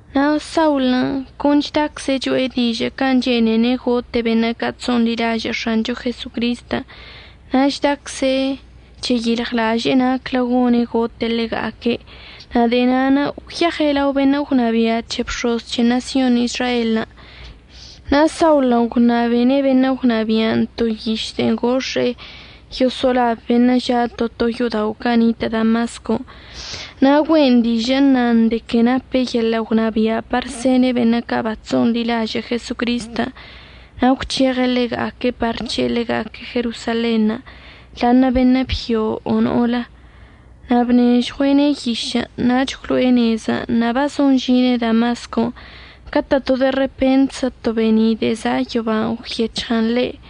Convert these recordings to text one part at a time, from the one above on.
Na' Saulən' con chdacze' cho'e dižə' can' chene'ene' gote' beṉə' ca' chso'onḻilažə' X̱ancho Jesocristən' na' chdacze' cheyilɉlaže'e naclə gone' gote' ḻega'aque'. Na' de'e na'anə' gwyeɉe' lao beṉə' gwnabia' c̱he bx̱oz c̱he ṉasyon Izraelən'. Na' Saulən' gwṉabene' beṉə' gwnabia'anə' to yiš de'e gox̱e'e yoso'olab beṉə' ža' to to yo'odao' ca' nitə' Damascon' na' güe'en dižə' əṉan de que nape' yeḻə' gwnabia' par sene' beṉə' ca' bachso'onḻilažə' Jesocristən' na' gwc̱heɉe' ḻega'aque' par əc̱he'e ḻega'aque' Jerosalenṉə', ḻa'aṉə' beṉə' byo o no'olə. Na' bnežɉue'ene' yišən' nach gwlo'e nezən' na' bazon əžine' Damascon' catə' to de repentzə to be'eni' de'e za' yoban' gwyec̱hɉən ḻe'.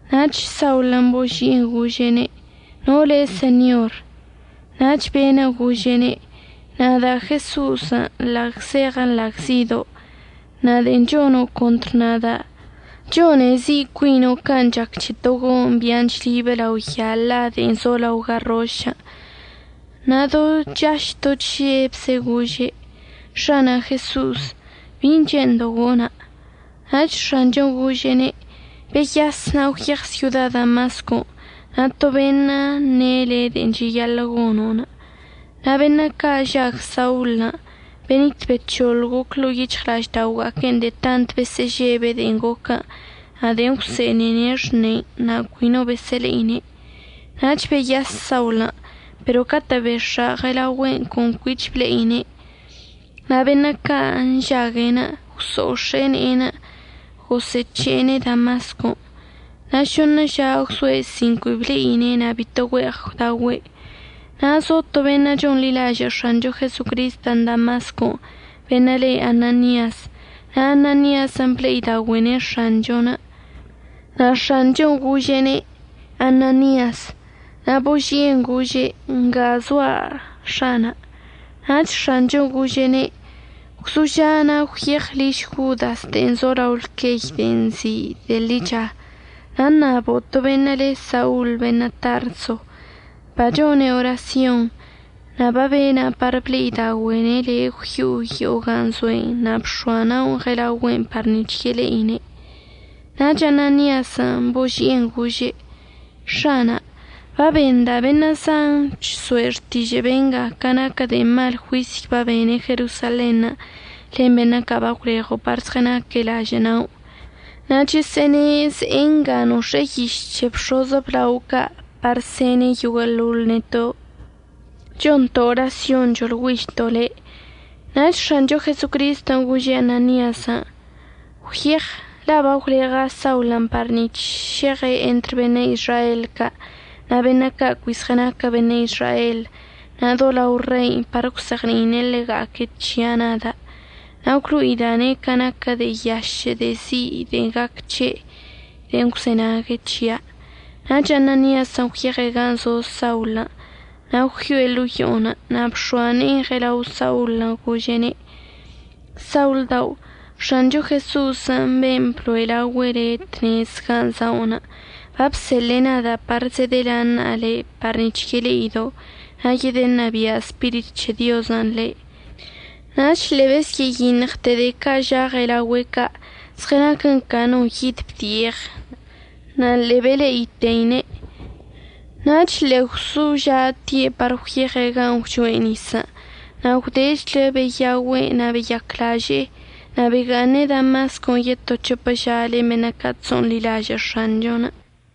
Nach Saulən' boži'en gože': ―¿No le' Señor? Nach be'enə' gože'ene': ―Nada' Jeso'osən' nḻagzeɉə nḻagzido'. Na' de'en chono' contr nada', chone zi' cuino' can' chac c̱he to go'oṉ bia'an chlibə lao ya la de'en zo lao garrošən'. Na' do chaž do chžebze' gože': ―X̱ana' Jeso'os, ¿bin' che'endo' gona'? Nach X̱anchon' gože'ene': ―Beyas na' gwyeɉ syoda Damascon' na' to beṉə' əṉe' le' de'en cheyaḻə' gono'. Na' beṉə' ca' žag Saulən' benit bec̱hoḻ goc ḻo'o yic̱hɉla'aždaoga'aque'enə' de'e tant besə'əžebe' de'en goquən' na' de'en gwse'enene' xnen' na' cui no besə'əle'ine'. Nach beyas Saulən', pero catə' bex̱a ɉelaogüe'enə' con cuich ble'ine'. Na' beṉə' ca' nžague'enə' gwso'ox̱e'e ne'enə' gosə'əc̱he'ene' Damascon'. Na' šoṉə ža gwzoe' sin cui ble'ine' na' bito güe'eɉ gwdaogüe'. Na' zo to beṉə' chonḻilažə' X̱ancho Jesocristən' Damascon' beṉə' le Ananias, na' Ananiasən' ble'idaogüe'ene' X̱anchon'. Na' X̱anchon' gože'ene': ―Ananias. Na' boži'en gože': ―Nga zoa' X̱ana'. Nach X̱anchon' gože'ene': ―Gwzoža' na' gwyeɉ liž Jodas de'en zo lao lqueyən' de'en nzi' “De'e Ḻicha”, na' ṉabo' to beṉə' le Saul beṉə' Tarso. Bachone' orasyon. Na' babena' par ble'idaogüe'ene' le' gwyo'o yo'o gan' zoe'enə' na' bx̱oa na'onə' ɉela'ogüe'enə' par nic̱h yele'ine'. Nach Ananiasən' boži'en gože': ―X̱ana', babenda' beṉə' zan chso'e xtižə' benga ca naquə de'e mal juisyən' babene' Jerosalenṉə' len beṉə' ca' bagwleɉo' par zɉənaque' lažə' na'onə'. Na' chəsə'əne' ze'e nga nox̱e'e yiš c̱he bx̱oz əblao ca' par sene' yoguə'əḻoḻ neto' chonto' orasyon choḻgüižto' le'. Nach X̱ancho Jesocristən' gože' Ananiasən': ―Gwyeɉ, la' bagwleɉa' Saulən' par nic̱h šeɉe' entr beṉə' Izrael ca' na' beṉə' ca' cui zɉənaquə beṉə' Izrael na' do lao rei par əgwzeɉni'ine' ḻega'aque' c̱hia' nada'. Na' gwlo'ida'ane' ca naquə de'e yašə' de'e zi' de'e gaquə c̱he' de'en əgwzenague' c̱hia'. Nach Ananiasən' gwyeɉe' gan' zo Saulən' na' gwyo'e ḻo'o yo'onə' na' bx̱oa ne'enə' ɉelao Saulən' gože'ene': ―Saul dao', X̱ancho Jeso'osən' ben' əbloe' laogüe' le' tnez gan' za'onə' babseḻe'e nada' par zedəlaṉa'a le' par nic̱h yele'ido' na' yedəṉabia' Spirit c̱he Diozən' le'. Nach ḻe'e besyə'əyiṉɉte de'e ca' ža' ɉelaogüe' ca' zɉənaquən ca no yid bdi'eɉ na' ḻe'e bele'iteine'. Nach ḻe'e gwzoža'ate' par gwyeɉe' gan' gwchoe' nisən'. Na' gwdechlə beyaogüe' na' beyaclaže'e. Na' bega'aṉe' Damascon' yeto c̱hopə ža len beṉə' ca' chso'onḻilažə' X̱anchon'.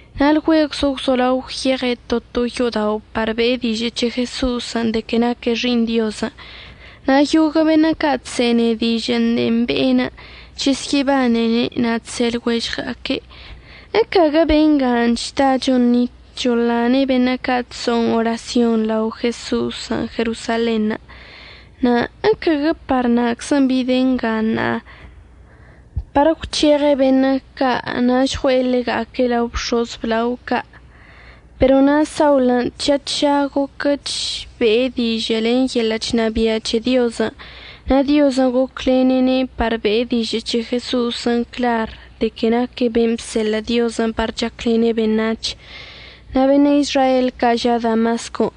Na' lgüegwzə gwzolao gwyeɉe' to to yo'odao' par be'e dižə' c̱he Jeso'osən' de que naque' Xi'iṉ Diozən'. Na' yoguə' beṉə' ca' chse'enene' dižə' de'en be'enə' chesyə'əbanene' na' chse' lɉuežɉga'aque': ―¿Ecaguə bengan' chda choṉit choḻane' beṉə' ca' chso'on orasyonṉə' lao Jeso'osən' Jerosalenṉə'? na' ¿əcaguə par na'aczən' bide' nga ṉa'a, par əgwc̱heɉe' beṉə' ca' na' žɉue'e ḻega'aque' lao bx̱oz əblao ca'? Pero na' Saulən' tža tža goquəch be'e dižə' len yeḻə' chnabia' c̱he Diozən' na' Diozən' goclene'ene' par be'e dižə' c̱he Jeso'osən' clar de que naque' ben' bseḻə' Diozən' par chaclene' beṉac̱hən', na' beṉə' Izrael ca' ža' Damascon'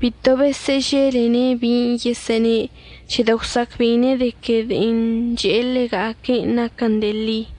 bito besə'əželene' bin' yesə'əne' c̱hedə' gwsa'acbe'ine' de que de'en che'e ḻega'aque' naquən de'e ḻi.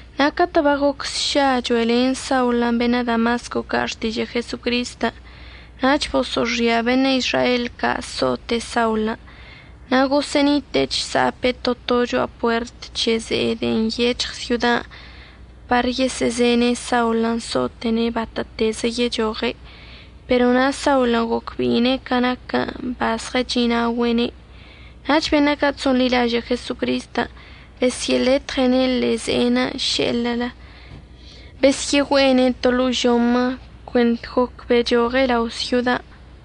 Na' catə' bagoc sša cho'elen Saulən' beṉə' Damasco ca' xtižə' Jesocristən' nach boso'oxia beṉə' Izrael ca' so'ote' Saulən'. Na' gosə'ənite'e chsa'ape' to to cho'a puert c̱he ze'enə' de'en nyec̱hɉ syodan' par yesə'əzene' Saulən' so'ote'ene' batə'ətezə yechoɉe' pero na' Saulən' gocbe'ine' ca naquən' bazɉəchi'inaogüe'ene'. Nach beṉə' ca' chso'onḻilažə' Jesocristən' besyə'əletɉe'ene' ḻe'e ze'enə' še'elə besyə'əgüe'ene' to ḻo'o žomə cuent goc bechoɉe' lao' syodan'.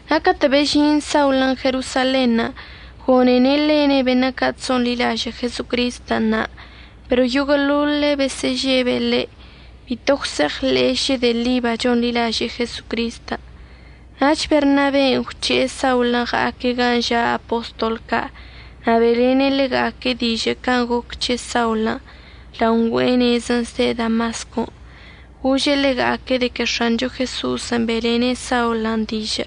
Na' catə' bežin Saulən' Jerosalenṉə' gone'ene' lene' beṉə' ca' chso'onḻilažə' Jesocristən' na', pero yoguə'əḻoḻe' besə'əžebe' ḻe', bito gwse'eɉḻe'e šə de'e ḻi bachonḻilaže'e Jesocristən'. Nach Bernaben' gwc̱he'e Saulən' ɉa'aque' gan' ža' apostol ca' na' be'elene' ḻega'aque' dižə' can' goquə c̱he Saulən' lao ngüe'e nezən' zde' Damascon' gože' ḻega'aque' de que X̱ancho Jeso'osən' be'elene' Saulən' dižə'.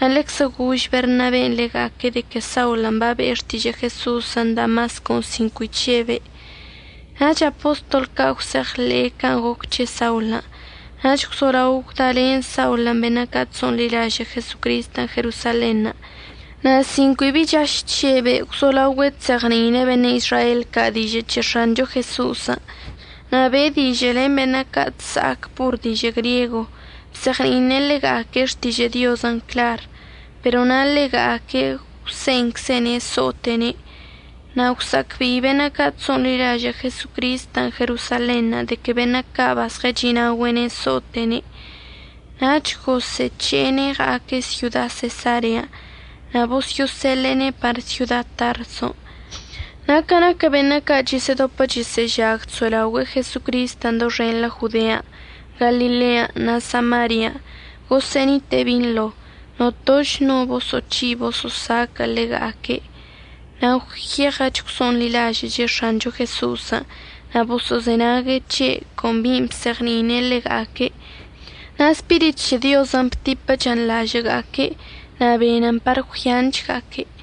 Na' ḻeczə gož Bernaben' ḻega'aque' de que Saulən' babe'e xtižə' Jeso'osən' Damascon' sin cui chžebe'. Nach apostol ca' gwse'eɉḻe'e can' goc c̱he Saulən', nach gwzolao gwdalen Saulən' beṉə' ca' chso'onḻilažə' Jesocristən' Jerosalenṉə'. Na' sin cui bi chaž chžebe' gwzolaogüe' chzeɉni'ine' beṉə' Izrael ca' dižə' c̱he X̱ancho Jeso'osən'. Na' be'e dižə' len beṉə' ca' chsa'ac por dižə' griego, bzeɉni'ine' ḻega'aque' xtižə' Diozən' clar, pero na' ḻega'aque' gwse'enczene' so'ote'ene'. Na' gwsa'acbe'i beṉə' ca' chso'onḻilažə' Jesocristən' Jerosalenṉə' de que beṉə' ca' bazɉəchi'inaogüe' so'ote'ene', nach gosə'əc̱he'ene' ɉa'aque' syoda Sesarean' na' bosyo'oseḻe'ene' par syoda Tarson'. Na' ca naquə beṉə' ca' chəsə'ədopə chəsə'əžague' chso'elaogüe'e Jesocristən' doxenḻə Jodean', Galilean' na' Samarian' gosə'ənite'e binḻo, notoch no no boso'oc̱hi' boso'osaquə' ḻega'aque', na' gwyeɉəch gwso'onḻilažə'əche' X̱ancho Jeso'osən' na' boso'ozenague' c̱he' con bin' bzeɉni'ine' ḻega'aque'. Na' Spirit c̱he Diozən' btipəchən lažə'əga'aque' na' benən par gwyanga'aque'.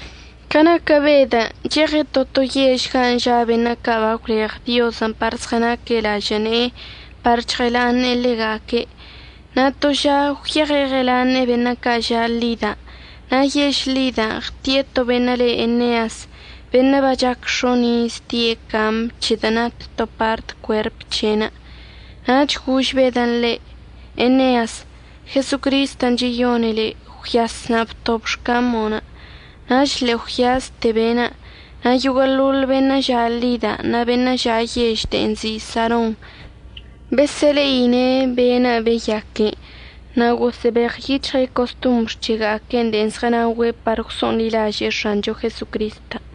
Ca naquə Bedən' cheɉe' to to yež gan' ža' beṉə' ca' bagwleɉ Diozən' par zɉənaque' lažə' ne'enə' par chɉəlaṉe'e ḻega'aque', na' to ža gwyeɉe' ɉəlaṉe'e beṉə' ca' ža' Lida. Na' yež Lidan' ɉti'e to beṉə' le' Eneas, beṉə' bachac x̱on' iz die' camən' c̱hedə' nat to part cuerp c̱he'enə'. Nach gož Bedən' ḻe': ―Eneas, Jesocristən' cheyone' le'. Gwyas na' btob xcamo'onə'. Nach ḻe'e gwyaste be'enə'. Na' yoguə'əḻoḻ beṉə' ža' Lidan' na' beṉə' ža' yež de'en nzi' Saron besə'əle'ine' be'enə' babeyaquene', na' gosə'əbeɉyic̱hɉe' costombr c̱hega'aque' de'en zɉənaogüe' par gwso'onḻilaže'e X̱ancho Jesocristən'.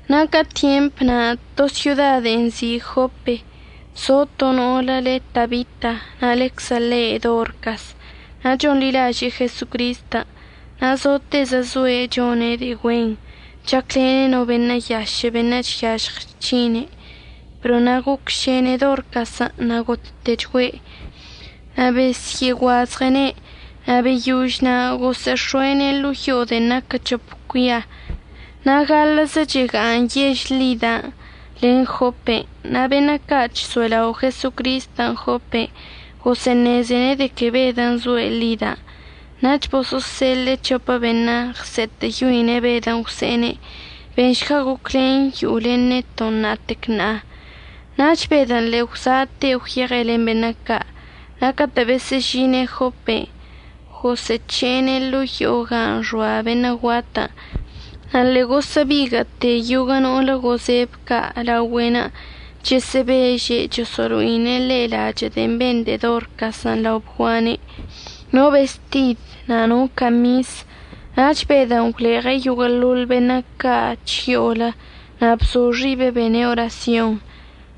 Na' ca tyemp na' to syoda de'en nzi' Jope zo to no'olə le Tabita na' ḻeczə le' Dorcas. Na' chonḻilaže'e Jesocristən' na' zotezə zoe' chone' de'e güen, chaclene' no beṉə' yašə' beṉə' chyažɉ chc̱hine. Pero na' gocšene Dorcasən' na' gottechgüe' na' besyə'əguazɉe'ene' na' beyož na' gosə'əx̱o'ene' ḻo'o yo'o de'en naquə c̱hop cuia. Na' gaḻə'əzə chega'aṉ yež Lidan' len Jopen' na' beṉə' ca' chso'elao' Jesocristən' Jopen' gosə'əṉezene' de que Bedən' zoe' Lidan'. Nach boso'oseḻe'e c̱hopə beṉə' ɉse'etə'əyoine' Bedən' gwse'ene': ―Benšga goclen yo'o len neto' ṉa'atec ṉa'a. Nach Bedən' ḻe'e gwza'ate' gwyeɉe' len beṉə' ca', na' catə' besə'əžine' Jopen' gosə'əc̱he'ene' ḻo'o yo'o gan' xoa beṉə' guatən' na' ḻe'e gosə'əbiguə'əte yoguə' no'olə gozeb ca' laogüe'enə' chəsə'əbeže' choso'olo'ine' ḻe' lachə' de'en ben de'e Dorcasən' lao bguane', no bestid na' no camis. Nach Bedən' gwleɉe' yoguə'əḻoḻ beṉə' ca' chyo'olə na' bzo xibe' bene' orasyon.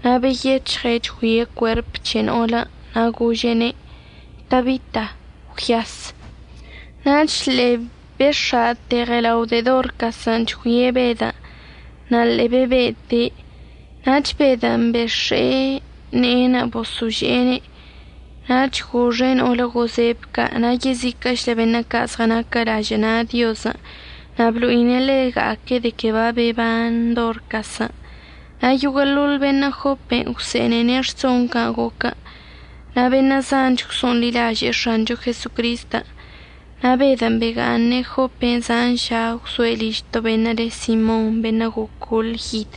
Na' beyec̱hɉe' chgüie' cuerp c̱he no'olən' na' gože'ene': ―Tabita, gwyas. Nach ḻe'e bex̱a'ate ɉelao de'e Dorcasən' chgüie' Bedən' na' ḻe'e bebe'ete'. Nach Bedən' bex̱e'e ne'enə' bosože'ene' nach goxe' no'olə gozeb ca' na' yeziquə'əchlə beṉə' ca' zɉənaque' lažə' na' Diozən' na' blo'ine' ḻega'aque' de que babeban Dorcasən'. Na' yoguə'əḻoḻ beṉə' Jopen' gwse'enene' rson can' goquən', na' beṉə' zanch gwso'onḻilaže'e X̱ancho Jesocristən'. Na' Bedən' bega'aṉe' Jopen' zan ža, gwzoe' liž to beṉə' le Simon, beṉə' gocol yid.